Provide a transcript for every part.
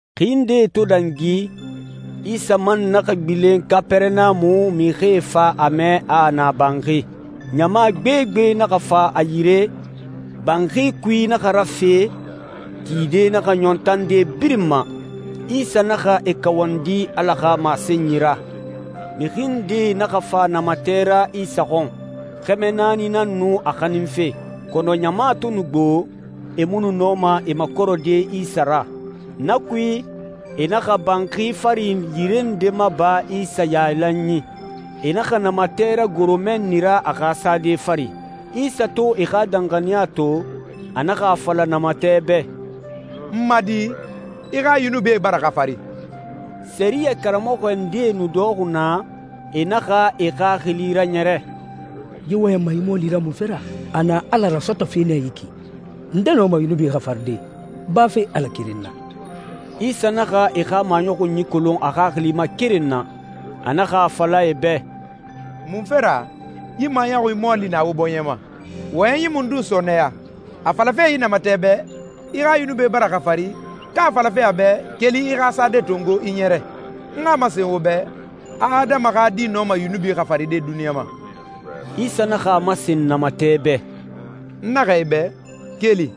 Xi ndee to dangi, Isa man naxa gbilen Kapɛrɛnamu, mixie fa a mɛ a a na banxi. Ɲama gbegbe naxa fa a yire, banxi kui naxa rafe, tide naxa ɲɔn tande birin ma. Isa naxa e kawandi Ala xa masenyi ra. Mixi ndee naxa fa namatɛ ra Isa xɔn. Xɛmɛ naani nan nu a xaninfe. Kɔnɔ ɲama to nu gbo, e mu nu nɔma e makɔrɛde Isa ra. Na kui, e naxa banxi fari yire nde maba Isa yailanyi. E naxa namatɛ ragoro mɛnni ra a xa sade fari. Isa to e xa danxaniya to, a naxa a fala namatɛ bɛ, «N ma di, i xa yunubie bara xafari.» Sɛriyɛ karamɔxɔ ndee nu dɔxɔxi naa, e naxa e xaxili raɲɛrɛ, «Yi wɔyɛnma yi mɔɔli ra munfe ra? A na Ala rasɔtɔfe nɛ yi ki! Nde nɔma yunubie xafaride, bafe Ala keren na?» Isa naxa e xa maɲɔxunyi kolon a xaxili ma keren na. A naxa a fala e bɛ, «Munfe ra yi maɲɔxunyi mɔɔli na wo bɔɲɛ ma? Wɔyɛnyi mundun sɔɔnɛya, a falafe yi namatɛ bɛ, ‹I xa yunubie bara xafari,› ka a falafe a bɛ, ‹Keli, i xa sade tongo, i ɲɛrɛ›? N xa a masen wo bɛ a Adama xa Di nɔma yunubi xafaride duniɲa ma.» Isa naxa a masen namatɛ bɛ, «N naxɛ i bɛ, keli,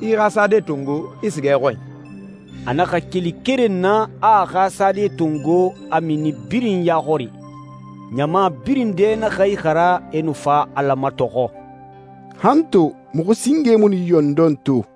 i i xa sade tongo, i siga i xɔnyi.» A naxa keli keren na, a a xa sade tongo, a mini birin ya xɔri. Ɲama birin dɛ naxa ixara, e nu fa Ala matɔxɔ, «Han to muxu singe mu nu yi ɲɔndɔn to.»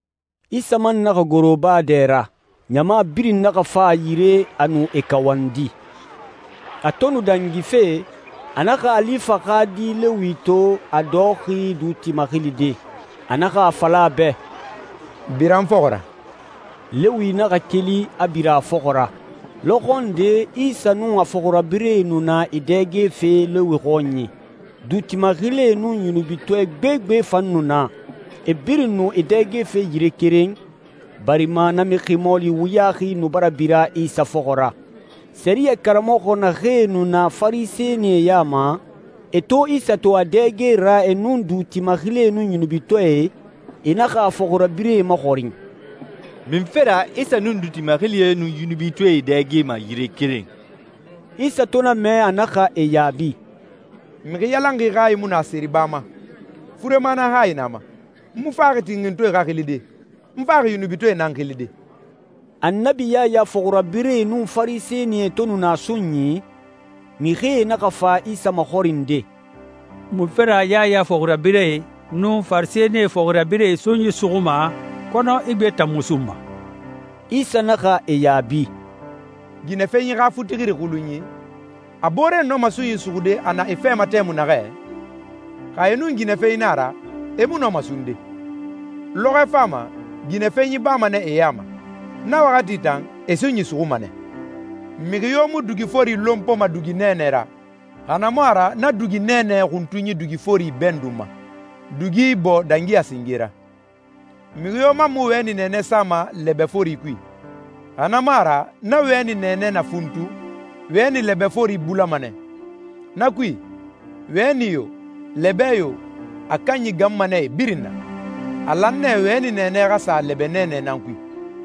Isa man naxa goro baa dɛ ra. Ɲama birin naxa fa a yire, a nu e kawandi. A to nu dangife, a naxa Alifa xa di Lewi to, a dɔxɔxi duuti maxilide. A naxa a fala a bɛ, «Bira n fɔxɔ ra.» Lewi naxa keli, a bira a fɔxɔ ra. Lɔxɔ nde Isa nun a fɔxirabirɛe nu na e dɛgefe Lewi xɔnyi. Duuti maxilie nun yunubitɔɛ gbegbe fan nu na, e birin nu e dɛgefe yire keren, barima na mixi mɔɔli wuyaxi nu bara bira Isa fɔxɔ ra. Sɛriyɛ karamɔxɔ naxee nu na Farisɛnie ya ma, e to Isa to a dɛge ra e nun duuti maxilie nun yunubitɔɛe, e naxa a fɔxirabirɛe maxɔrin, «Munfe ra Isa nun duuti maxilie nun yunubitɔɛe e dɛgema yire keren?» Isa to na mɛ, a naxa e yaabi, «Mixi yalanxi hayi mu na seriba ma. Furema nan hayi na a ma. N mu faxi tinxintɔɛe xa xilide. N faxi yunubitɔɛe nan xilide.» Annabi Yaya fɔxirabirɛe nun Farisɛnie to nu na sunyi, mixie naxa fa Isa maxɔrinde, «Munfe ra Yaya fɔxirabirɛe nun Farisɛnie fɔxirabirɛe sunyi suxuma, kɔnɔ i gbee tan mu sunma?» Isa naxa e yaabi, «Ginɛfenyi xa futixiri xulunyi, a booree nɔma sunyi suxude a na e fɛ ma tɛmui naxɛ? Xa e nun ginɛfenyi na a ra, e mu nɔma sunde. Lɔxɔɛ fama, ginɛfenyi bama nɛ e ya ma. Na waxati tan, e sunyi suxuma nɛ. Mixi yo mu dugi fori lonpoma dugi nɛɛnɛ ra, xa na mu a ra na dugi nɛɛnɛ xuntunyi dugi fori ibɛndunma, dugi ibɔɔ dangi a singe ra. Mixi yo man mu wɛni nɛɛnɛ sama lɛbɛ fori kui, xa na mu a ra na wɛni nɛɛnɛ na funtu, wɛni lɛbɛ fori bulama nɛ. Na kui, wɛni yo, lɛbɛ yo, a kanyi ganma nɛ e birin na. A lan nɛ wɛni nɛɛnɛ xa sa lɛbɛ nɛɛnɛ nan kui.»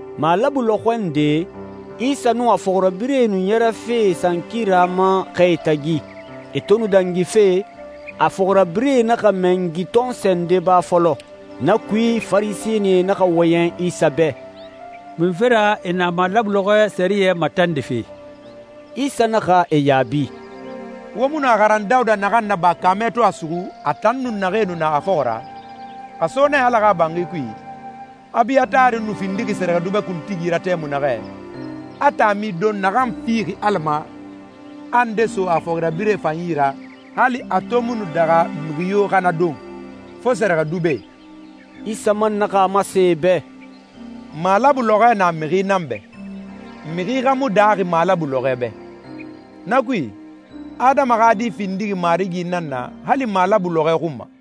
Malabu lɔxɔ nde, Isa nun a fɔxirabirɛe nu ɲɛrɛfe sankira ma xɛe tagi. E to nu dangife, a fɔxirabirɛe naxa mɛngi tɔnsɔɛ nde ba fɔlɔ. Na kui, Farisɛnie naxa wɔyɛn Isa bɛ, «Munfe ra e na malabu lɔxɔɛ sɛriyɛ matandife?» Isa naxa e yaabi, «Wo mu nu a xaran Dawuda naxan naba kaamɛ to a suxu, a tan nun naxee nu na a fɔxɔ ra? A so nɛ Ala xa banxi kui, Abiyatari nu findixi sɛrɛxɛdubɛ kuntigi ra tɛmui naxɛ, a taami don naxan fixi Ala ma, a nde so a fɔxirabirɛe fan yi ra, hali a to mu nu daxa mixi yo xa na don, fo sɛrɛxɛdubɛe.» Isa man naxa a masen e bɛ, «Malabu lɔxɔɛ na mixi nan bɛ, mixi xa mu daaxi malabu lɔxɔɛ bɛ. Na kui, Adama xa Di findixi Marigi nan na hali malabu lɔxɔɛ xun ma.»